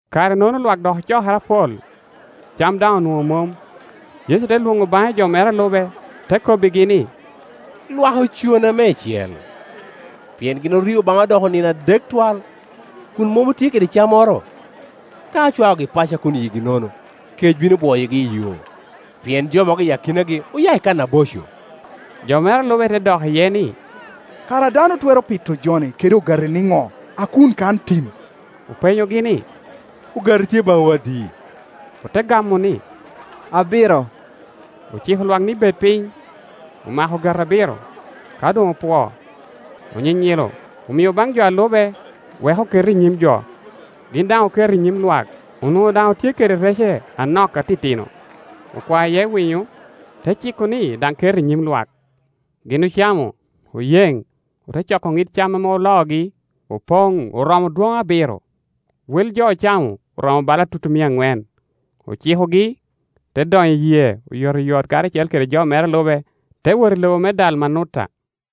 Kare-nono lwak dok ocokere apol, cam daŋ onwoŋo mom. Yecu te lwoŋo baŋe jo mere a lube, te kobbigi ni, “Lwak ocona meicel, pien gin orio baŋa odoko nino adek twal, kun mom otye kede cammoro. Ka acwaogi paco a kun yigi nono, kec bino bwoyogi i yo; pien jo mogo i akinagi oya i kan aboco.” Jo mere a lube te dok iye ni, “Kara dano twero pito jo-ni kede ogati nino a kun kan tim?” Openyogi ni, “Ogati tye baŋwu adi?” Ote gamo ni, “Abiro.” Ociko lwak ni bed piny, omako ogati abiro; ka doŋopwoo, onyinyilo, omio baŋ jo a lube wek oket i nyim jo, gin daŋ oketo i nyim lwak. Onwoŋo daŋ otye kede rece anok atitino; okwao iye winyo, te ciko ni daŋ ket i nyim lwak. Gin ocamo, oyeŋ; ote coko ŋid cam ame oloogi, opoŋ oromo dwoŋ abiro. Wel jo ocamo oromo bala tutumia aŋwen. Ocikogi; te donyo i yee oyotoyot karacel kede jo mere a lube, te wot i lobo me Dalmanuta.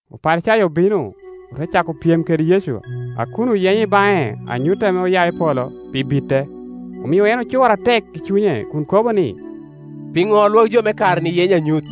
Oparicayo obino, ote cako pyem kede Yecu a kun oyenyo i baŋe anyut ame oya i polo, pi bite. Omio en ocur atek i cunye kun kobo ni, “Piŋo lwagi jo me kare-ni yenyo anyut?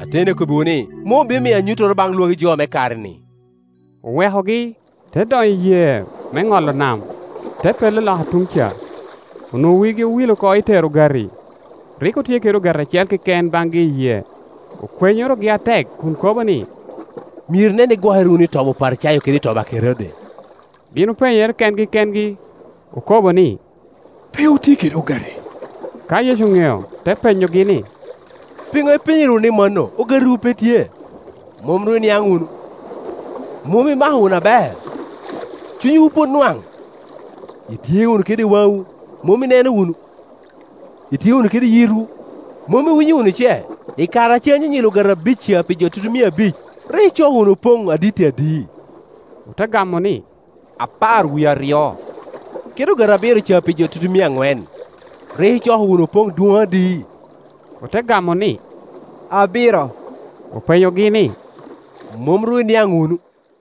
Ateni akobbiwu ni, mom obino miyo anyuttoro baŋ lwagi jo me kare-ni.” Owekogi, te donyo i yee me ŋolo nam, te pello loka tuŋ ca. Onwoŋo wigi owil oko i tero ogati, rik otye kede ogati acel keken baŋgi i yee. Okwenyorogi atek kun kobo ni, “Myero inen ni igwokere wunu i tobi Oparicayo kede i tobi a Kerode.” Gin openyere kengi kengi, okobo ni, “Pe otye kede ogati.” Ka Yecu oŋeo, te penyogi ni, “Piŋo ipenyere wunu ni mano, ogatiwu pe tye? Mom ru iniaŋ wunu? Mom imako wunu aber? Cunywu pwod nwaŋ? ltye wunu kede waŋwu, mom ineno wunu? Itye wunu kede yitwu, mom iwinyo wunu ce? I kare a cen anyinyilo ogati abic ca pi jo tutumia abic, rik icoko wunu opoŋ aditti adi?” Ote gamo ni, “Apar wie aryo. Kede ogati abiro ca pi jo tutumia aŋwen, rik icoko wun opoŋ dwoŋ adi?” Ote gamo ni, “Abiro.” Openyogi ni, “Mom ru iniaŋ wunu?”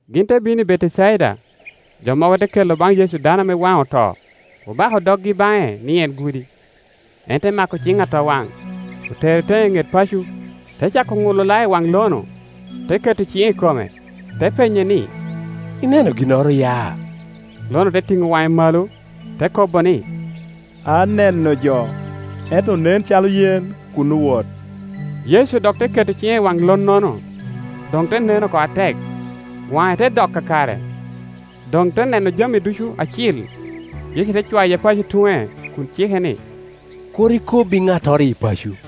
Gin te bino i Betecaida, jo mogo te kelo baŋ Yecu dano ame waŋe oto, obako doggi baŋe ni en gudi. En te mako ciŋ atowaŋ, otere teŋe i ŋet paco, te cako ŋulo lao i waŋ lo-nu, te keto ciŋe i kome, te penye ni, “Ineno ginnoro ya?” Lo-nu te tiŋo waŋe malo, te kobo ni, “Aneno jo, ento onen acalo yen kun owot.” Yecu dok te keto ciŋe i waŋ lo-nono; doŋ te neno oko atek, waŋe te dok kakare, doŋ te neno jami ducu acil. Yecu te cwaye paco tuŋe kun cike ni, “Kur ikob i ŋattoro iyi paco.”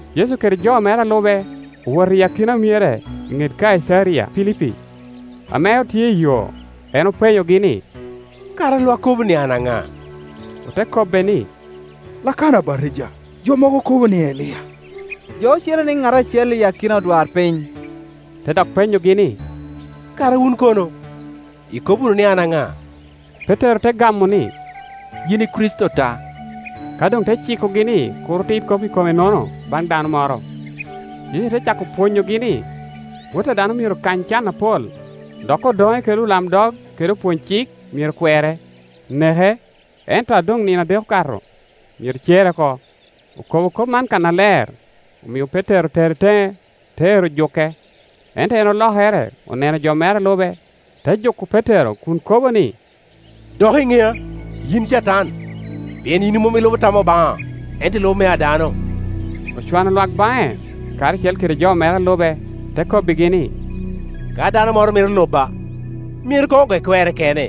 Yecu kede jo mere a lube owoto i akina myere i ŋet Kaicaria Pilipi. Ame otye iyo, en openyogi ni, “Kara lwak kobo ni an ŋa?” Ote kobbe ni, “Lakana Abatija; jo mogo kobo ni, Elia, jo ocele ni ŋat acel i akina odwarpiny.” Te dok penyogi ni, “Kara wun kono, ikobo wunu ni an ŋa?” Petero te gamo ni, “Yin i Kricito ta.” Ka doŋ te cikogi ni kur otit kop i kome-nono baŋ dano moro. Yecu te cako pwonyogi ni, Wot a dano myero kany can apol, dok odoŋe kede olamdog kede opwony-cik myero kwere, neke, ento a doŋ nino adek okato, myero cere oko. Okobo kop man kannaler, omio Petero otere teŋe, te ero juke. Ento en olokere oneno jo mere a lube, te juko Petero kun kobo ni, “Dok i ŋea, yin Catan! Pien yin mom ilubo tam Obaŋa, ento ilubo mea dano.” Ocwano lwak baŋe, karacel kede jo mere a lube, te kobbigi ni, “Ka dano moro mito luba, myero koŋ oge kwerre kene,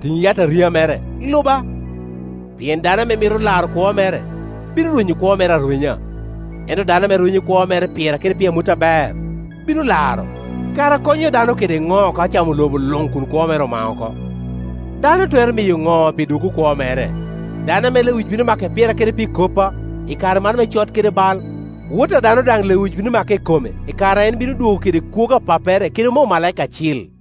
tiŋ yataria mere, luba. Pien dano ame mito laro kwo mere, bino rwenyo kwo mere arwenya, ento dano ame rwenyo kwo mere pira kede pi amut aber, bino laro. Kara konyo dano kede ŋo ka ocamo lobo luŋ kun kwo mere omao oko? Dano twero miyo ŋo pi dwoggo kwo mere? Dano ame lewic bino make pira kede pi koppa, i kare man me cot kede me bal, Wot a dano daŋ lewic bino make i kome i kare a en bino dwogo kede kwogo a Pappere kede me omalaika acil.”